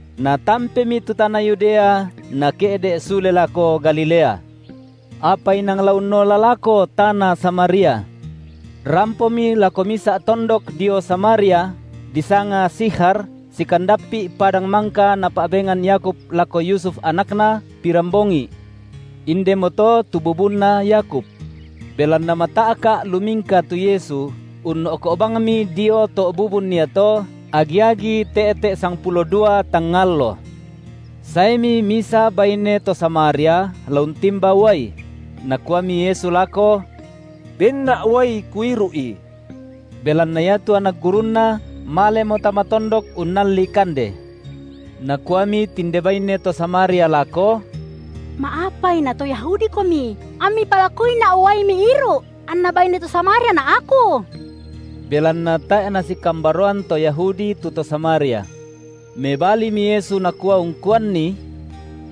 Natampemi tu tana Yudea, Nake’de’ sule lako Galilea. Apa inang la unnola lako tana Samaria. Rampomi lako misa’ tondok dio Samaria, disanga Sikhar sikandappi’ padang mangka napa’bengan Yakub lako Yusuf anakna, pirambongi’. Indemoto tu bubunna Yakub. Belanna mata’ka’ lumingka tu Yesu, unno’ko’ bangmi dio to’ bubun iato, agi-agi te’te’ sangpulo dua tangnga allo. Saemi misa baine to Samaria la untimba uai; Nakuami Yesu lako: Benna’ uai Kuiru’i. Belanna iatu anak gurunNa malemo tama tondok unnalli kande. Nakuami tinde baine to Samaria lako: Ma’apai na to YahudiKomi amMi palakuina’ uai Miiru’ anna baine to Samariana’ aku? (Belanna tae’ nasikambaroan to Yahudi tu to Samaria.) Mebalimi Yesu Nakua ungkuanni: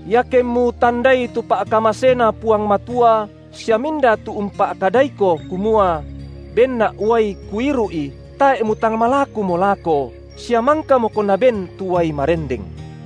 Iakemmu tandai tu pa’kamaseNa Puang Matua sia minda tu umpa’kadaiko, kumua: benNa’ uai Kuiru’i, tae’ mutang malakumo lako, sia mangkamoko Naben tu uai marendeng.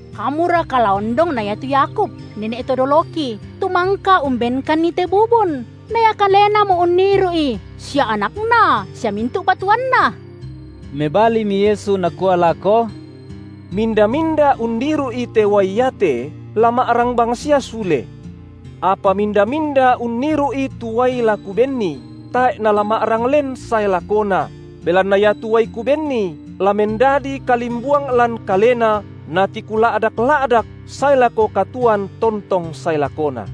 Kamuraka la ondong na iatu Yakub, nene’ to doloki, tu mangka umbenkanni te bubun, na ia kalenamo unniru’i, sia anakna sia mintu’ patuoanna? Mebalimi Yesu Nakua lako: Minda-minda unniru’i te uai iate, la ma’rang bangsia sule. Apa minda-minda unniru’i tu uai la Kubenni, tae’ nala ma’rang len sae lakona, belanna iatu uai Kubenni la mendadi kalimbuang lan kalena natikula’dak-la’dak sae lako katuoan tontong sae lakona.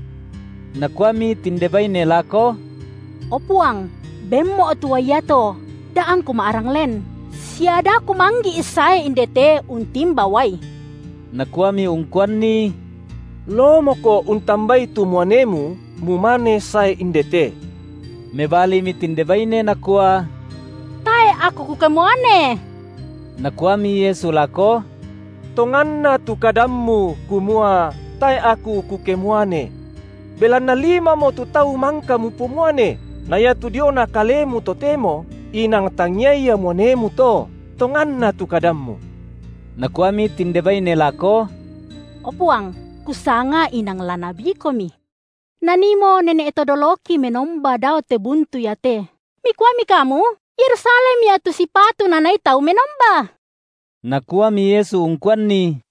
Nakuami tinde baine lako: O Puang, benmo’ tu uai iato, da angku ma’rang len, sia da kumanggi’ sae indete untimba uai. Nakuami ungkuanni: Loomoko untambai tu muanemu, mumane sae indete. Mebalimi tinde baine nakua: Tae’ aku kukemuane. Nakuami Yesu lako: Tonganna tu kadammu, kumua: tae’ aku kukemuane. Belanna limamo tu tau mangka mupomuane, na iatu diona kalemu totemo, inang tangia ia muanemu to. Tonganna tu kadammu. Nakuami tinde baine lako: O Puang, kusanga inang la nabiKomi. Naniimo nene’ to doloki menomba dao te buntu iate, Mikuami Kamu, Yerusalem ia tu sipatu nanii tau menomba. Nakuami Yesu ungkuanni: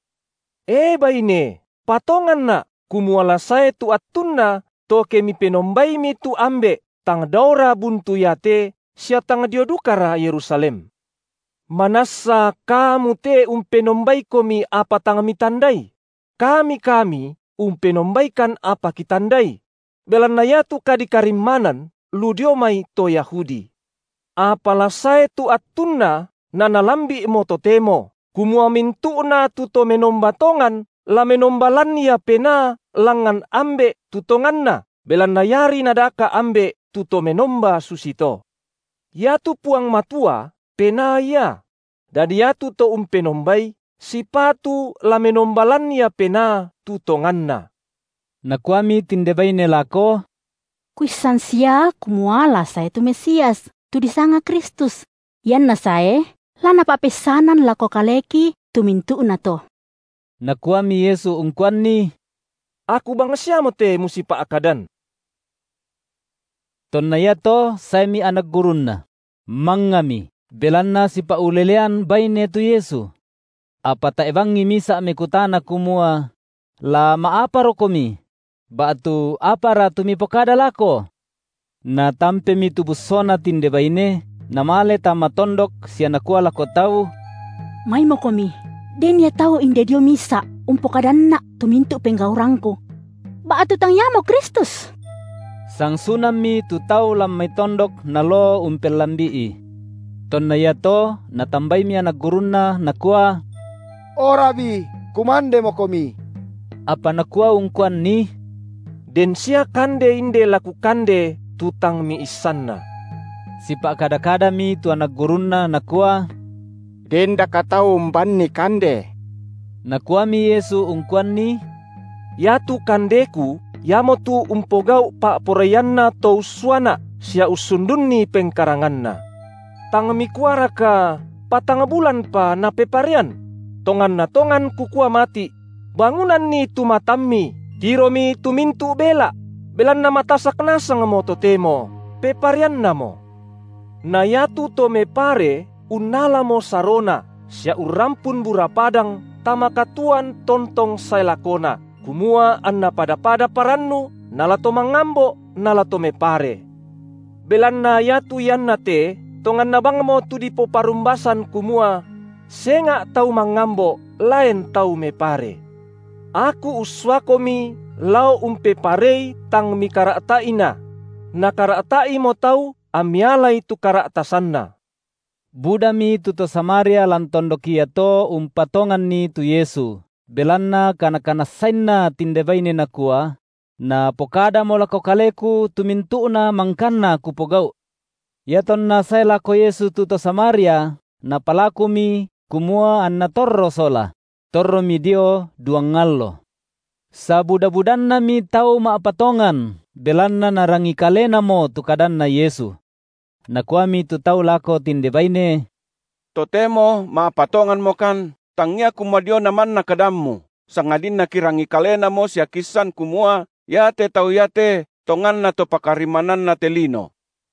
E baine, patonganNa’, kumua la sae tu attunna, to ke mipenombaimi tu Ambe’, tang daora buntu iate sia tang dio dukara Yerusalem. Manassa kamu te umpenombaikomi apa tang mitandai; kami kami umpenombaikan apa kitandai; belanna iatu kadikarimmanan lu dio mai to Yahudi. Apa la sae tu attunna, na nalambi’mo totemo, kumua mintu’na tu to menomba tongan la menomba lan ia penaa langngan Ambe’ tu tonganna; belanna iari Nadaka’ Ambe’ tu to menomba susito. Iatu Puang Matua Penaa Ia: dadi iatu to umpenombai, sipatu la menomba lan ia penaa tu tonganna. Nakuami tinde baine lako: Kuissan sia kumua la sae tu Mesias, tu disanga Kristus; ianNa sae, la Napa’peissanan lako kaleki tu mintu’nato. Nakuami Yesu ungkuanni: Aku bangsiamote musipa’kadan. Tonna iato saemi anak gurunNa; mangngami, belanna sipa’ulelean baine tu Yesu. Apa tae’ bangi misa’ mekutana kumua: La ma’aparoKomi? ba’tu Apara tu Mipokada lako? Natampemi tu bussona tinde baine, namale tama tondok sia nakua lako tau: Maimokomi, den ia tau inde dio misa’ umpokadanna’ tu mintu’ penggaurangku. Ba’tu tang Iamo Kristus? Sangsunammi tu tau lan mai tondok naloo umpellambi’I. Tonna iato natambaimi anak gurunNa, nakua: O Rabi, kumandemoKomi. Apa Nakua ungkuanni: Den sia kande inde la Kukande, tu tang miissanna. Sipa’kada-kadami tu anak gurunNa nakua: Dendaka tau umbanNi kande? Nakuami Yesu ungkuanni: Iatu kandeKu, iamotu umpogau’ pa’poraianNa To ussuaNa’, sia ussundunni pengkaranganNa. Tang mikuaraka: Patang bulanpa napeparean? Tonganna tongan Kukua mati’: Bangunanni tu matammi, tiromi tu mintu’ bela’; belanna matasak nasangmo totemo, pepareannamo. Na iatu to mepare unnalamo sarona, sia urrampun bura padang tama katuoan tontong sae lakona, kumua anna pada-pada parannu nala to mangambo’ nala to mepare. Belanna iatu ianna te tonganna bangmo tu dipoparumbasan kumua: Senga’ tau mangambo’, laen tau mepare. Aku ussuakomi lao umpeparei tang mikara’ta’ina; nakara’ta’imo tau ammi alai tu kara’tasanna. Budami tu to Samaria lan tondok iato umpatonganNi tu Yesu, belanna kanakanassainna tinde baine nakua: Napokadamo lako kaleku tu mintu’na mangkanna kupogau’. Iatonna sae lako Yesu tu to Samaria, napalakumi, kumua anNa torro sola; torromi dio duang allo. Sabuda-budannami tau ma’patongan belanna narangi kalenamo tu kadanNa Yesu. Nakuami tu tau lako tinde baine: Totemo ma’patonganmokan tangia kumua diona manna kadammu, sangadinna kirangi kalenamo sia kiissan kumua iate Tau iate tonganna to Pakarimmananna te lino.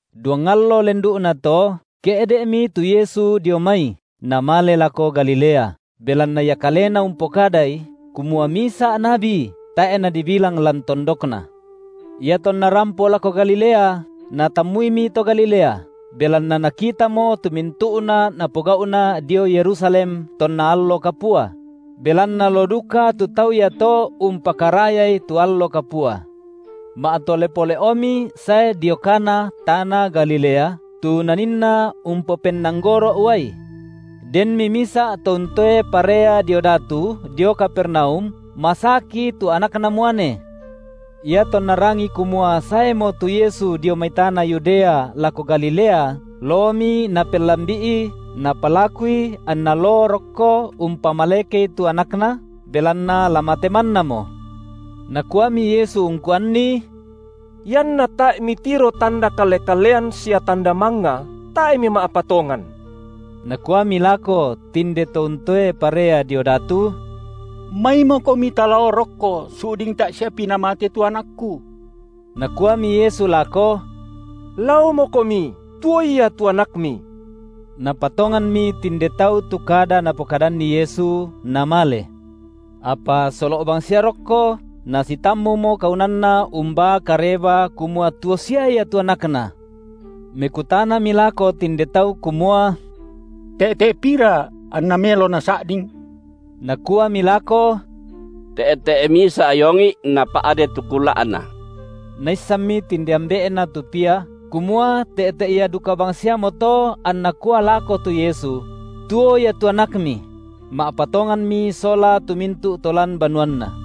Duang allo lendu’nato ke’de’mi tu Yesu dio mai Namale lako Galilea, belanna Ia Kalena umpokadai, kumua misa’ nabi tae’ nadibilang lan tondokna. Iatonna rampo lako Galilea, natammuimi to Galilea, belanna nakitamo tu mintu’na Napogau’na dio Yerusalem tonna allo kapua; belanna loo duka tu tau iato umpakarayai tu allo kapua. Ma’tole pole’omi sae dio Kana, tana Galilea, tu Naninna umpopennanggoro’ uai. Denmi misa’ to untoe parea dio datu, dio Kapernaum, masaki tu anakna muane. Iatonna rangi kumua saemo tu Yesu dio mai tana Yudea lako Galilea, loomi napellambi’I, napalakuI anNa loo rokko umpamalekei tu anakna, belanna la mate mannamo. Nakuami Yesu ungkuanni: Ianna tae’ mitiro tanda kalle-kallean sia tanda mangnga, tae’ mima’patongan. Nakuami lako tinde to untoe parea dio datu: MaimoKomi talao rokko su’ding tae’ siapi namate tu anakku. Nakuami Yesu lako: Laomokomi, tuo ia tu anakmi. Napatonganmi tinde tau tu kada Napokadanni Yesu, namale. Apa solo’ bangsia rokko, nasitammumo kaunanna umbaa kareba kumua tuo sia ia tu anakna. Mekutanami lako tinde tau kumua: te’te’ pira anna melo nasa’ding? Nakuami lako: Te’te’ misa’ iongi’ napa’de tu kula’na. Naissanmi tinde ambe’na tu pia, kumua te’te’ ia duka bangsiamoto anNa kua lako tu Yesu: Tuo ia tu anakmi; ma’patonganmi sola tu mintu’ to lan banuanna.